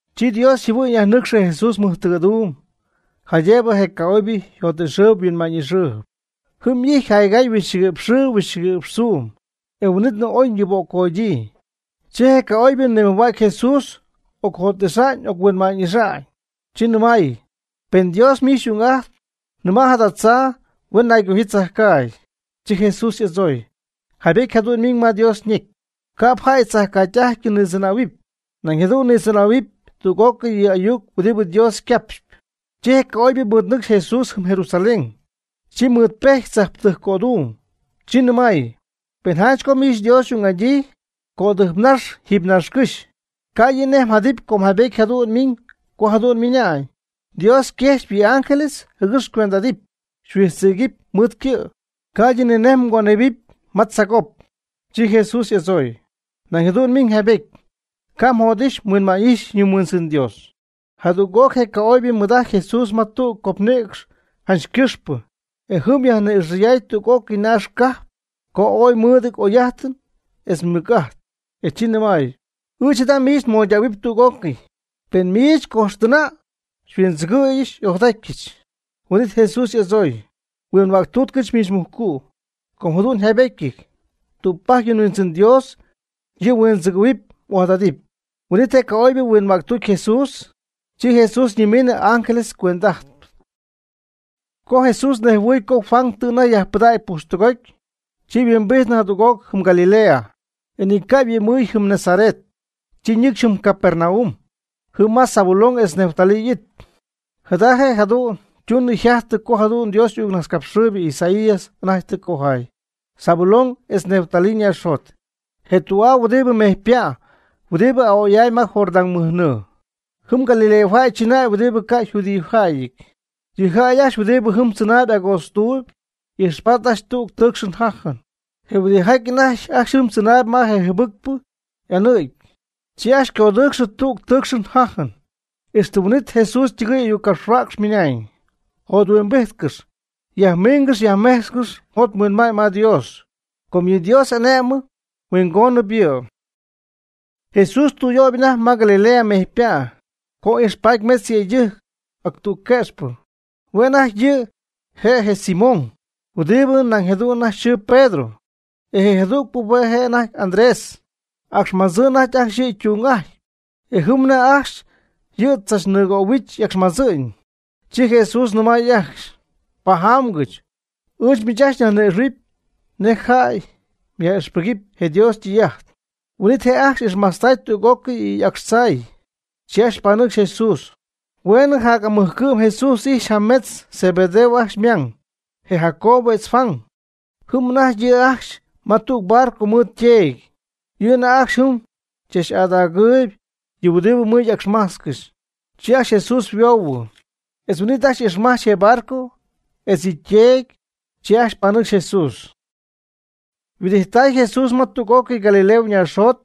Chi Dios yjɨhuɨ'ñ yajnɨcxy Jesús mɨjtɨgɨ̈duum jaydëbɨ je ca'oybɨ yjot'ixɨɨyb yhuinma'ñ'ixɨɨyb. Jɨm y'ijty jaygay huixchɨgui'px xɨɨ huixchɨgui'px tzuum, e huin'itnɨ ooy yɨböccodyii. Chi je ca'oybɨ nimɨjhuägy Jesús ocjot'ixa'ñ oc-huinma'ñ'ixa'ñ, chi nɨmay: ―Pen Dios miich xy'ung'ajtp, nɨma' jada tzaa huen naygojyii tzajcaagy. Chi Jesús y'adzooy: ―Jaybety jadu'n ymiñ ma Dios ñecy: “Ca'p jäy tzajcaagytɨ'ajty nitzɨnähuɨpy, nañ jadu'n nitzɨnähuɨpy tüg'ócɨy yɨ ayuc huɨdibɨ Dios ycapxp.” Chi je ca'oybɨ mɨɨdnɨcxy Jesús jɨm Jerusalén, chi ymɨɨdpejty tzajptɨjc cöduum. Chi nɨmay: ―Pen janch co miich Dios xy'ung'adyii, cödɨjpnax jiiby naaxcɨ́xy, ca' yɨ' nej mjadɨpy com jaybety jadu'n ymiñ co jadu'n ymɨna'ñ: Dios yquexyp yɨ' y'ángeles jɨgɨx xycuend'adɨpy xyhuidzɨpy mɨɨd ycɨ', ca'ydɨ ninej mgönepy ma tzaagop. Chi Jesús y'adzooy: ―Nañ jadu'n ymiñ jaybety: “Ca' mjot'ixɨpy mhuinma'ñ'ixɨpy yɨ mhuindzɨn Dios.” Jadüg'oc je ca'oybɨ ymɨɨd'ajty Jesús ma tüg copnïcx janch cɨjxpɨ, e jɨm yajni'ixɨɨyday tüg'ócɨy naax cajp co ooy mɨɨdɨty oy'ajtɨn etz mɨc'ajt. E chi nɨmay: ―Ɨɨch jada miich nmoydähuɨpy tüg'ócɨy, pen miich cojxtɨna' xyhuindzɨgɨ̈yɨch xy'ojadatyɨch. Huin'it Jesús y'adzooy: ―Huinhuäctutcɨch miich mujcu', com jadu'n yjaybetyɨty: “Tügpajc yɨ mHuindzɨn Dios yɨ' mhuindzɨgɨ̈huɨpy m'ojadadɨpy.” Huin'it je ca'oybɨ huinhuäctucy Jesús, chi Jesús ñimiinɨ ángeles ycuend'ajtɨ. Co Jesús nejhuɨɨy co Juan tɨ anajty yajpɨdägy pujxtɨgoty, chi yhuimbijtnɨ jadüg'oc jɨm Galilea. E ni ca' yhuɨ'mɨɨy jɨm Nazaret, chi ñɨcxy jɨm Capernaum, jɨm ma Zabulón etz Neftalí y'it. Jada je' jadu'n tunɨ jajtɨ jadu'n nej Dios y'ayucnajtzcapxɨɨybɨ Isaías anajty tɨ cojaay: Zabulón etz Neftalí ñaaxjot. Je tü'aa huɨdibɨ mejypa' huɨdibɨ a'oy'amy ma Jordán mɨj nɨɨ. Jɨm Galileajäy chɨnäy huɨdibɨ ca' yjudiojäyɨty. Yɨ jäy ajcxy huɨdibɨ jɨm tzɨnaayb agootztuuby ijxpaty ajcxy tüg tɨɨcxɨn jajɨn. Je huɨdijaty anajty ajcxy tzɨnaayb ma je jɨbɨcpɨ y'anicɨ̈y, chi ajcxy ycodɨcxɨɨy tügɨ tɨɨcxɨn jajɨn. Ixtɨ huin'it Jesús ytɨgɨɨy ayuccapxhuäcxp ymɨnañ: ―Jothuimbijtcɨx, yajmingɨx yajmejtzcɨx mjot mhuinma'ñ ma Dios, com yɨ Dios y'ane'mɨn huingonɨp yɨ'. Jesús tüyöyb anajty ma Galilea mejypa', co ijxpaty metz yëydɨjc ac tüg quëxpɨ, hue' anajty yɨ' je' je Simón, huɨdibɨ nañ jadu'n yxɨɨ Pedro, e je jadügpɨ hue' je' anajty Andrés. Acxmadzɨɨ anajty ajcxy yɨ' ytung'ajty e jɨm anajty ajcxy yɨ' tzachnɨɨgöhuich y'acxmadzɨ'ñ. Chi Jesús nɨmay ajcxy: ―Pajamgɨch, ɨɨch miich ajcxy nyajni'ixɨ̈huɨpy nej jäy myaj'ixpɨgɨpy je Dios ytɨy'ajt. Huin'it je' ajcxy ixmajtztay tüg'ócɨy yɨ y'acxtzaay, chi ajcxy panɨcxy Jesús. Hueenɨ jac'amɨjcɨ'm Jesús ijxy janimetz Zebedeo ajcxy ymang, je Jacobo etz Juan. Jɨm anajty yɨ' ajcxy ma tüg barco mɨɨd yteedy, yɨ' anajty ajcxy yɨ' jɨm chach'adagɨɨyb yɨ huɨdibɨ mɨ'acxmajtzcɨxy. Chi ajcxy Jesús yhuoohuɨ. E huin'it ajcxy ixmajtztay je barco etz yɨ' yteedy, chi ajcxy panɨcxy Jesús. Huɨdijttay Jesús ma tüg'ócɨy Galilea ñaaxjot,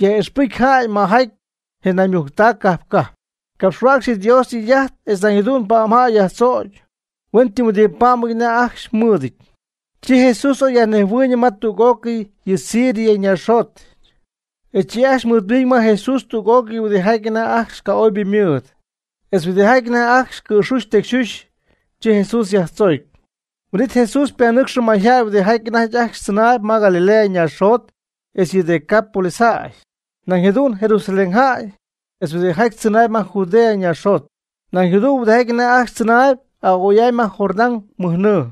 yaj'ixpɨcy jäy majaty je naymujctac cajp cajp. Capxhuäcxy yɨ Dios ytɨy'ajt etz nañ jadu'n pa'mjäy yajtzocy huen ytɨmyhuɨdipá'mɨty anajty ajcxy ymɨɨd. Chi Jesús oy yajnejhuɨɨyñɨ ma tüg'ócɨy yɨ Siria ñaaxjot, e chi ajcxy mɨɨdmiñ ma Jesús tüg'ócɨy huɨdijaty anajty ajcxy ca'oybɨ mɨɨd, etz huɨdijaty anajty ajcxy cɨ̈xuxy tecyxuxy, chi Jesús yajtzoocy. Huin'it Jesús ypanɨcxɨ mayjäy huɨdijaty anajty ajcxy tzɨnaayb ma Galilea ñaaxjot etz yɨ Decapolis jäy, nañ jadu'n Jerusalén jäy etz huɨdijaty tzɨnaayb ma Judea ñaaxjot, nañ jadu'n huɨdijaty anajty ajcxy tzɨnaayb a'oy'amy ma Jordán mɨj nɨɨ.